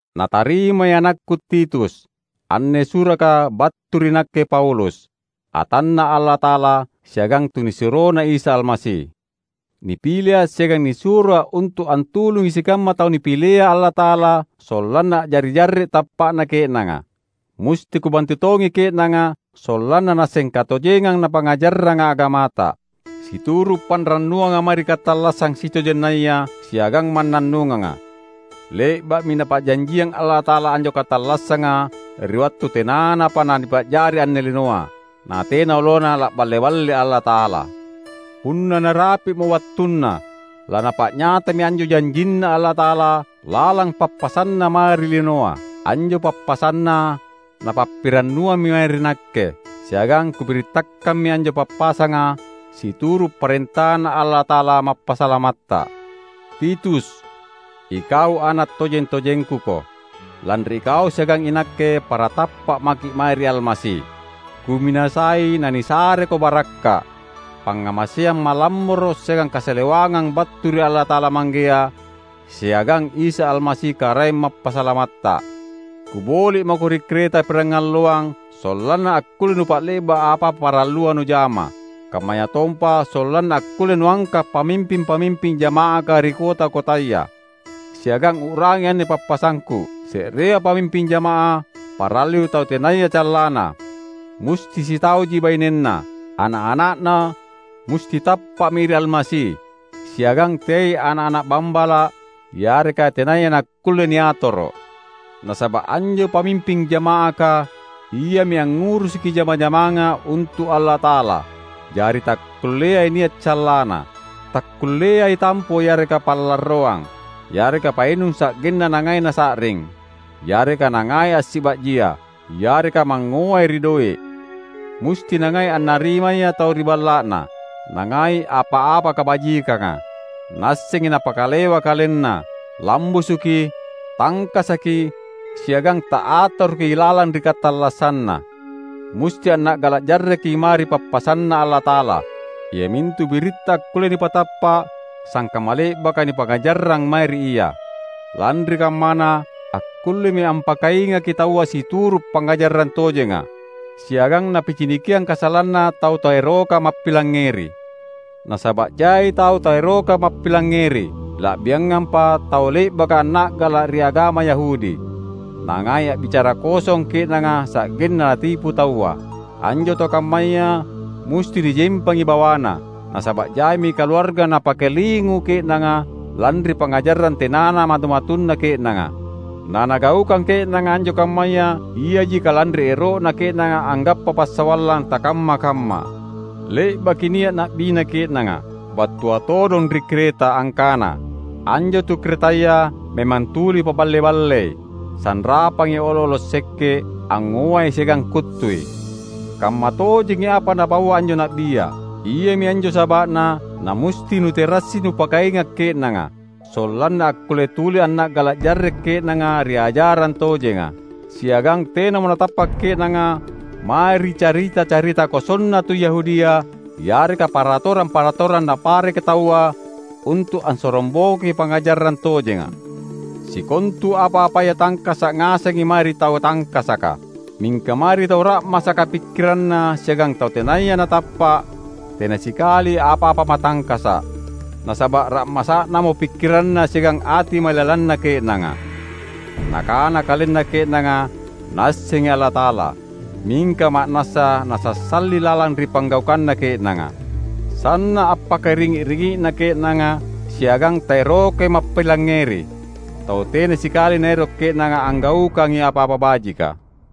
Natarimai anakku Titus! Anne suraka battu ri nakke Paulus, atanNa Allata’ala siagang tunisuroNa Isa Almasi. Nipilea’ siagang nisuroa’ untu’ antulungi sikamma tau Napilea Allata’ala sollanna a’jari jarre’ tappa’na ke’nanga. Musti kubantu tongi ke’nanga sollanna naasseng katojengang napangngajarranga agamata, situru’ panrannuanga mae ri katallassang sitojennaya siagang mannannunganga. Le’ba’mi Napa’janjiang Allata’ala anjo katallassanga ri wattu tenanapa nanipa’jari anne linoa; natena olona la’balle-balle Allata’ala. Punna narapi’mo wattunna, laNapa’nyatami anjo janjinNa Allata’ala lalang pappasanNa mae ri linoa. Anjo pappasanNa Napappirannuammi mae ri nakke, siagang kubirittakammi anjo pappasanga situru’ parentaNa Allata’ala Mappasalamatta. Titus! Ikau ana’ tojeng-tojengkuko, lanri ikau siagang inakke para tappa’ maki’ mae ri Almasi. Kuminasai nanisareko barakka’, pangngamaseang malammoro’ siagang kasalewangang battu ri Allata’ala Manggea siagang Isa Almasi Karaeng Mappasalamatta. Kuboli’ mako ri Kreta pirangalloang sollanna akkulle nupa’le’ba’ apa-apa parallua nujama. Kammayatompa sollanna akkulle nuangka’ pamimping-pamimping jama’aka ri kota-kotaya. Siagang u’rangi anne pappasangku: Se’rea pamimping jama’ah parallui tau tenaya callanna; musti sitauji bainenna; ana’-ana’na musti tappa’mi ri Almasi, siagang teai ana’-ana’ bambala’ yareka tenaya nakkulle niatoro’. Nasaba’ anjo pamimping jama’aka, iami angngurusuki jama-jamanga untu’ Allata’ala; jari takkulleai nia’ callanna. Takkulleai tampo yareka pa’larroang, yareka painung sa’genna nangai nasa’ring, yareka nangai assiba’jia, yareka mangngoai ri doe’. Musti nangai annarimaya tau ri balla’na, nangai apa-apa kabajikanga, naassengi napakalewa kalenna, lambusuki, tangkasaki siagang ta’atoroki lalang ri katallassanna. Musti anna’gala’ jarreki mae ri pappasanNa Allata’ala, iamintu biritta akkullea nipatappa’ sangkamma le’baka nipangngajarrang mae ri ia. Lanri kammana, akkullemi ampakaingaki taua situru’ pangngajarang tojenga, siagang napicinikiang kasalanna tau taeroka mappilangngeri. Nasaba’ jai tau taeroka mappilangngeri, la’biangampa tau le’baka anna’gala’ ri agama Yahudi; nangai a’bicara kosong ke’nanga sa’genna natipu taua. Anjo tau kammaya musti nijempangi bawana, nasaba’ jaimi kaluarga napakalingu ke’nanga lanri pangngajarang tenana matu-matunna ke’nanga. Nanagaukang ke’nanga anjo kammaya iaji kalanri ero’na ke’nanga anggappa passawallang takamma-kamma! Le’baki nia’ na’bina ke’nanga, battua todong ri Kreta, angkana, "Anjo tu Kretaya memang tuli paballe-ballei, sanrapangi olo’-olo’ sekke’, angngoai siagang kuttui." Kammatojengi apa napaua anjo na’bia. Iami anjo saba’na namusti nuterassi nupakainga’ ke’nanga; sollanna akkulle tuli anna’gala’ jarre’ ke’nanga ri ajarang tojenga, siagang tenamo natappa’ ke’nanga mae ri carita-carita kosonna tu Yahudia yareka paratorang-paratorang napareka taua untu’ ansorongbokoi pangngajarang tojenga. Sikontu apa-apaya tangkasa’ ngasengi mae ri tau tangkasaka. Mingka mae ri tau ra’masaka pikkiranna siagang tau tenaya natappa’ tena sikali apa-apa matangkasa’, nasaba’ ra’masa’namo pikkiranna siagang ati mailalanna ke’nanga! Nakana kalenna ke’nanga Naassengi Allata’ala, mingka ma’nassa nasassali lalang ri panggaukanna ke’nanga. Sanna’ appakaringi’-ringi’na ke’nanga siagang taerokai mappilangngeri; tau tena sikali naero’ ke’nanga anggaukangi apa-apa bajika.